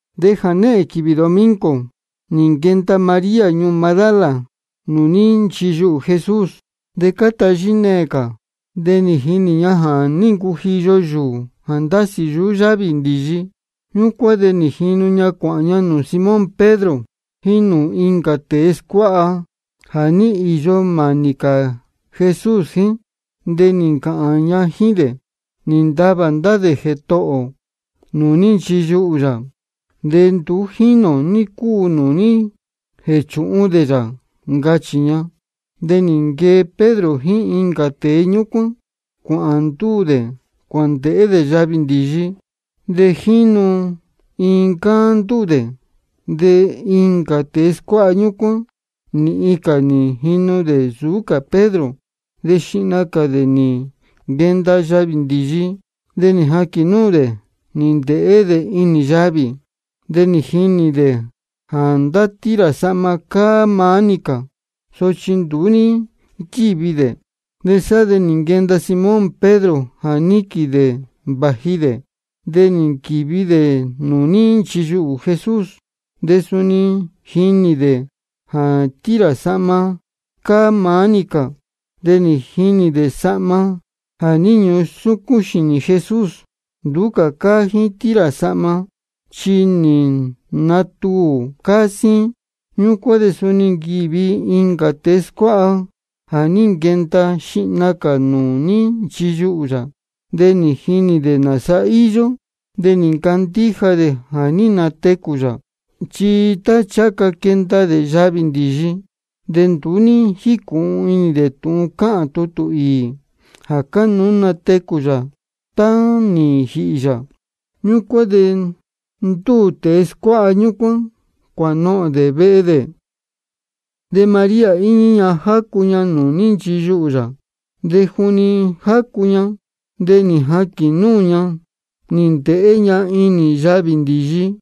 De jānehēn quīvī domingo nī nquenda María ñuū Magdala nūū ní nchiyuhū Jesús, de cáta yíneē cā. De nī jinī ña jā ní ncujiyo yūū jā ndásī yuhú yávī ndīyi. Ñúcuán de jínu ña cuāhān ña nūū Simón Pedro jíín nūū incā tēe scuáha jā ní īyo mānī cā Jesús jíín. De nī ncāhān ña jíín dē: Nī ntavā ndá dē Jētohō ō nūū ní nchiyuhū yā, de nduú jínī ō ní cúu nūū ní jēchūhun dē yā, ncachī ña. De nī nquee Pedro jíín incā tēe ñúcuán, cuāhān ndúū dē cuāndēhé dē yavī ndīyi. De jínu iin ncáá ndúū dē. De incā tēe scuáha ñúcuán, nīhin cā nī jinu dē nsūú cā Pedro. De xihna cā dē nī nquenda yavī ndīyi. De nī jaquīn núū dē, nī ndēhé dē inī yavī. De nī jinī dē jā ndá tira sahma cáá maá-ni cā. Sochi nduú ní nquívi dē. De sá de nī nquenda Simón Pedro jā níquīn dē vāji dē. De nī nquīvi dē nūū ní nchiyuhū Jesús. De suni nī jinī dē jā tira sahma cáá maá-ni cā. De nī jinī dē sahma jā ní ñusúcún xīnī Jesús, nduú cáá jíín tira sahma, chi nī natuū de cáá síín. Ñúcuán de suni nī nquīvi incā tēe scuáha jā ní nquenda xihna cā nūū ní nchiyuhū yā. De nī jinī dē nāsa íyó, de nī ncandíja dē jā ní natecū yā. Chi tá ncháha ca quenda dē yavī ndīyi, de nduú ní jícūhun inī dē tūhun cáhān tutū īī, jā cánuú natecū yā tá ja nī jīhī yā. Ñúcuán de ndúū tēe scuáha ñúcuán, cuānohōn dē vehe dē. De María íñí ña jácu ña nūū ní nchiyuhū yā. De juni jácu ña, de nī jaquīn núū ña, nī ndēhé ña inī yavī ndīyi.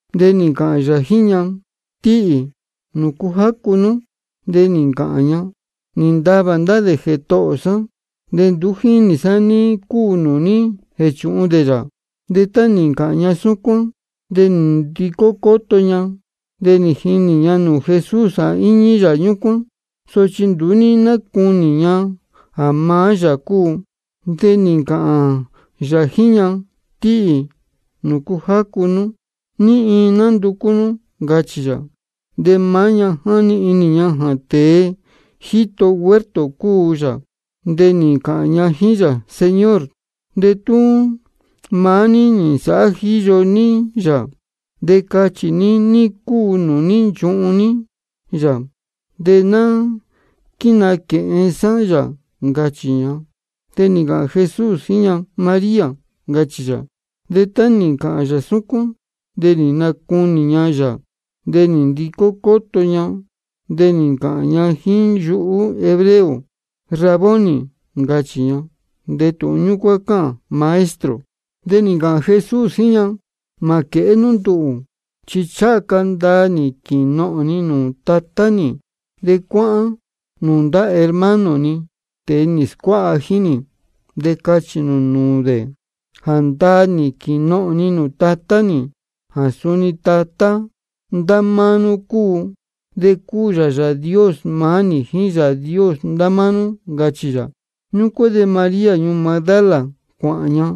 De nī ncāhān yā jíín ña: Tíhī, ¿nūcu jácu nú? De nī ncāhān ña: Nī ntavā ndá dē Jētohō sá, de nduú jínī sá ní cúu nūū ní jēchūhun dē yā. De tá nī ncāhān ña súcuán, de nī ndicó cóto ña, de nī jinī ña nūū Jesús jā íñí yā ñúcuán. Sochi nduú ní nácunī ña jā maá yā cúu. De nī ncāhān yā jíín ña: Tíhī, ¿nūcu jácu nú? ¿Ní iin nánducú nú? ncachī yā. De maá ña jáni inī ña jā tēe jíto huerto cúu yā. De nī ncāhān ña jíín yā: Señor, de tú maá ní nī nsāhá jíyo ní yā, de cachī ní ní cúu nūū ní nchuhun ní yā, de ná quínāquēhen sá yā, ncachī ña. De nī ncāhān Jesús jíín ña: María, ncachī yā. De tá nī ncāhān yā súcuán, de nī nacunī ña yā, de nī ndicó cóto ña, de nī ncāhān ña jíín yuhú hebreo: Raboni, ncachī ña. De tūhun ñúcuán cáhān: Maestro. De nī ncāhān Jesús jíín ña: Mā quēhé nú nduhū, chi ncháha ca ndaa nī quīnohōn ni nūū Tatá nī. De cuáhán nūū ndá hermano ni, tēe nī scuáha jíín nī, de cachī nū nūū dē jā ndaa nī quīnohōn ni nūū Tatá nī, jā suni Tatá ndá máá nú cúu. De cúu yā Yāā Dios maá nī jíín Yāā Dios ndá máá nú, ncachī yā. Ñúcuán de María ñuū Magdala, cuāhān ña,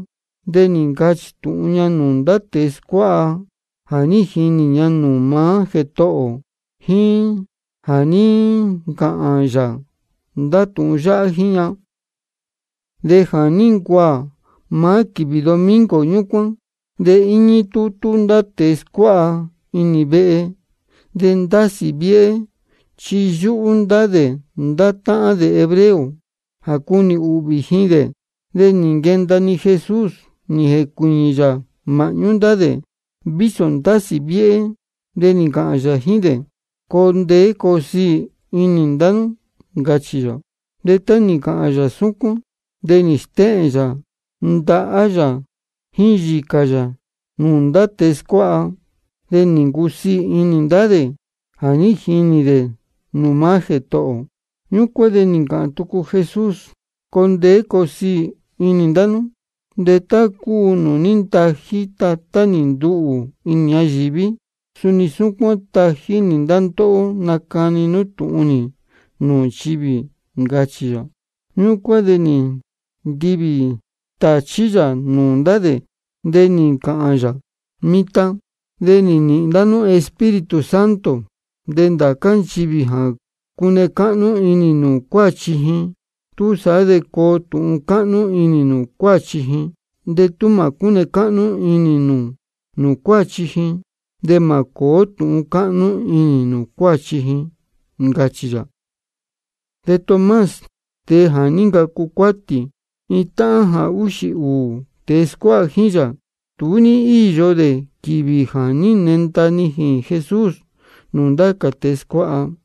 de nī ncachī tūhun ña nūū ndá tēe scuáha jā ní jinī ña nūū maá Jētohō ō jíín jā ní ncāhān yā ndá tūhun yáhá jíín ña. De jā ní ncuaā maá quīvī domingo ñúcuán, de íñí tútú ndá tēe scuáha inī iin vehe. De ndásī viéhé, chi yúhú ndá dē ndá táhán dē hebreo jā cunī ūhvī ji dē. De nī nquenda-ni Jesús, nī jēcuīñī yā māhñú ndá dē, vísō ndásī viéhé, de nī ncāhān yā jíín dē: Coo ndeé coo siī inī ndá nú, ncachī yā. De tá nī ncāhān yā súcuán, de nī stéhēn yā ndahá yā jíín yīcā yā nūū ndá tēe scuáha. De nī ncusiī inī ndá dē jā ní jinī dē nūū maá Jētohō ō. Ñúcuán de nī ncāhān tucu Jesús: Coo ndeé coo siī inī ndá nú. De tá cúu nūū ní ntají Tatá nī nduhū inī ñayīví, suni súcuán tají nī ndá ndóhó nacani nú tūhun nī nūū nchivī, ncachī yā. Ñúcuán de nī ntivī tāchí yā nūū ndá dē. De nī ncāhān yā: Mitan de nī nīhīn ndá nú Espíritu Santo. De ndācá nchivī jā cune cáhnú inī nū nūū cuáchi ji, túsaá de coo tūhun cáhnú inī nūū cuáchi ji. De tú mā cúne cáhnú inī nū nūū cuáchi ji, de mā cōó tūhun cáhnú inī nūū cuáchi ji, ncachī yā. De Tomás, tēe jā ní ncacu cuátī, iin táhān jā úxī ūū tēe scuáha jíín yā, nduú ní íyo dē quīvī jā ní nenda nijīn Jesús nūū ndá cā tēe scuáha.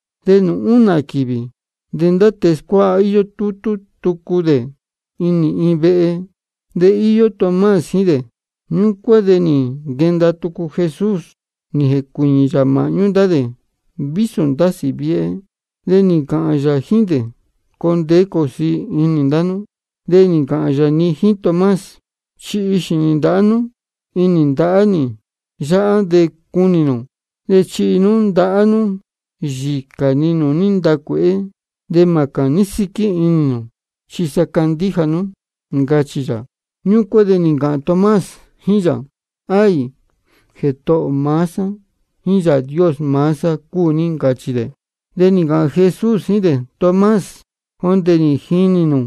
De nūū únā quīvī, de ndá tēe scuáha íyó tútú tucu dē inī iin vehe. De íyó Tomás jíín dē. Ñúcuán de nī nquenda tucu Jesús, nī jēcuīñī yā māhñú ndá dē, vísō ndásī viéhé. De nī ncāhān yā jíín dē: Coo ndeé coo siī inī ndá nú. De nī ncāhān yā-ni jíín Tomás: Chihi xīnī ndāhá nú inī ndahá nī yáhá de cunī nū. De chihi nú ndahá nú yīcā ni nūū ní ntacuēhé. De mā cāní síquí cā inī nū, chi sa candíja nú, ncachī yā. Ñúcuán de nī ncāhān Tomás jíín yā: Aī, Jētohō maá sá jíín Yāā Dios maá sá cúu ní, ncachī dē. De nī ncāhān Jesús jíín dē: Tomás, jondē nī jinī nū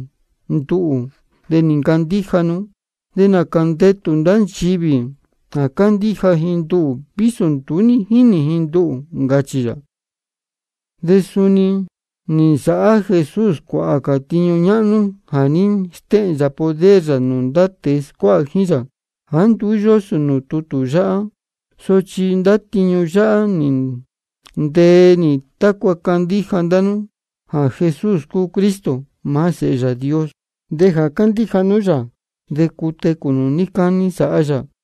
nduhū, de nī ncandíja nú. De nācā ndetū ndá nchivī jā candíja ji nduhū vísō nduú ní jínī ji nduhū, ncachī yā. De suni nī nsāhá Jesús cuāhā cā tiñu ñáhnú jā ní stéhēn yā poder yā nūū ndá tēe scuáha jíín yā, jāá nduú yósō nūū tutū yáhá. Sochi ndá tiñu yáhá nī ntee nī tácua candíja ndá nú jā Jesús cúu Cristo, maá Sēhe Yāā Dios. De jā candíja nú yā, de cutecū nū níí cání sāhá yā.